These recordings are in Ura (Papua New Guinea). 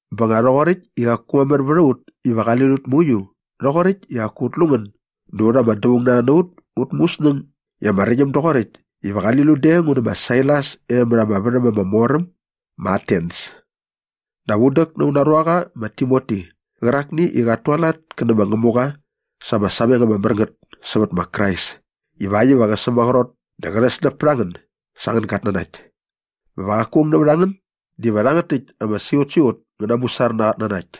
Bä nga rhoqoräkt i qaku mamär vät a ut iva qali lut mauiu rhoqoräkt i qaku ut lu ngän dä ut ama dävaung na rha na ut ut mu ut snäng i ama räqyäm doqoräkt iva qali lun de ngu nä ma Sailas e mät ama värhäm ama mor äm ma Atens. Dap un däk na auna ruaqa ma Timoti qärakni i qat tualat kä nä ma Ngämuqa sa ama sameng ama mär ngät sävät ma Krais ivakt iva qä sämaqrot dä qä rhäsläp pät a ngän sa angän gatnanakt bä va qaku aung nävät a ngän diva rhangät täkt ama siqutsiqut ngä namusar na aa qatnanakt.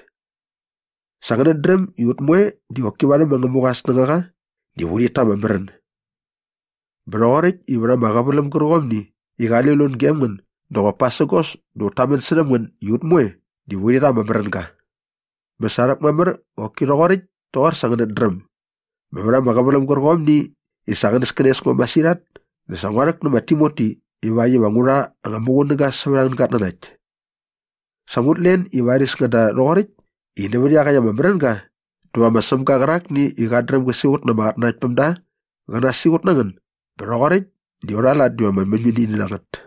Sa ngänät dräm i ut moe di qoki varhäm ma Ngämuqa aa snängaqa diva urhit ta ama märän. Bä rhoqoräkt i vät ama qäväläm gärqomni i qali lut gem ngän dä qop pasägos dä ut tamän särhäm ngän i ut moe diva urhi rha ama märänga. Bä sa rhäkmamär qoki rhoqoräkt toqor sa ngänät dräm. Bä vät ama qäväläm gärqomni i sa qänäskänes ngo masirhat dä sa ngua rhäk nä ma Timoti ivakt iva ngu rha anga muqunäga sävät angän gatnanakt. Sä ngut len i varis ngäda rhoqoräkt i nävät iaqäkt ama märänga dä va ma Sämga qärakni i qat dräm gä siqut na ama qatnanaktpämda qä nasiqut na ngän bä rhoqoräkt di aurha lat diva ama mäñmäñini na ngät.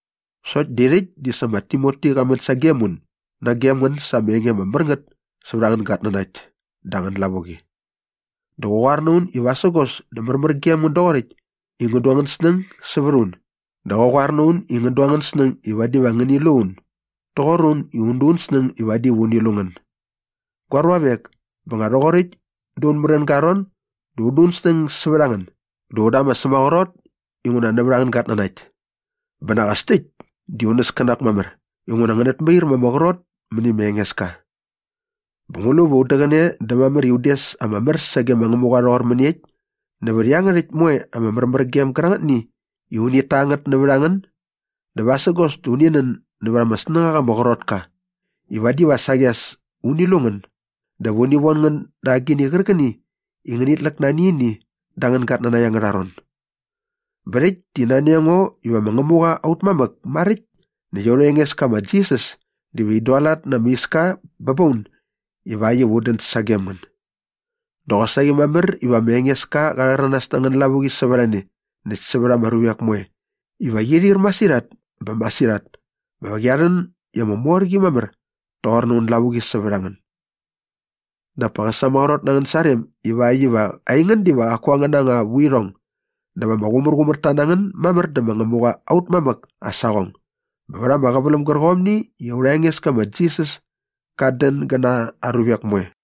Sokt di rhäkt di sa ma Timoti qa män sagem un nagem ngän sa ama enge ama mär ngät sävät angän gatnanakt dä angän lavuqi. Dä qa qoar na un i vasägos dä märmär gem ngän doqoräkt i ngän du angän snäng sävät a un dä qa qoar na un i ngän du angän snäng i vadi va ngäni lu un doqor un i un du un snäng i vadi va uni lu ngän. Gua ruavek, bä nga rhoqoräkt da aun märänga aa ron dä un du un snäng sävät a ngän dä un da ama sämaqrot inguna nävät angän gatnanakt. Bä nak as täkt di un näskänak mamär inguna ngänät mair ma ama qrot mäni ma Engeska. Bä ngu lu va un däqäne dä mamär i un des ama mär sage ma Ngämuqa rhoqor mäniekt nävät iangärhäkt moe ama märmärgem gärangätni i unit ta ngät nävät a ngän? Dä vasägos dä uni nän nävät ama snängaqa ama qrot ka i vadi va saqi as uni lu ngän dä va uni von ngän da agini qärqäni i ngänit läk nani ini da angän gatnanakt angärha ron. Bä rhäkt di nani a ngo iva ma Ngämuqa aut mamäk maräkt näkt aurha Engeska ma Jisas diva in dualat na ama iska bä ba un ivakt iva un dän sagem ngän. Dä qosaqi mamär iva ma Engeska qa rhäranas na angän lavuqi sävät a ne näkt sävät ama ruvek moe iva qi ir masirhat bä masirhat bä va qia rhän i ama mor qi mamär toqor aun lavuqi sävät a ngän. Dap pa qä sämaqrot na angän sarem ivakt iva aingän diva qaku angäna anga vuirhong dä va ama qumärqumärta na ngän mamär dä ma Ngämuqa aut mamäk aa saqong bät ama qäväläm gärqomni i aurha Engeska ma Jisas kat dän gä na aa ruvek moe.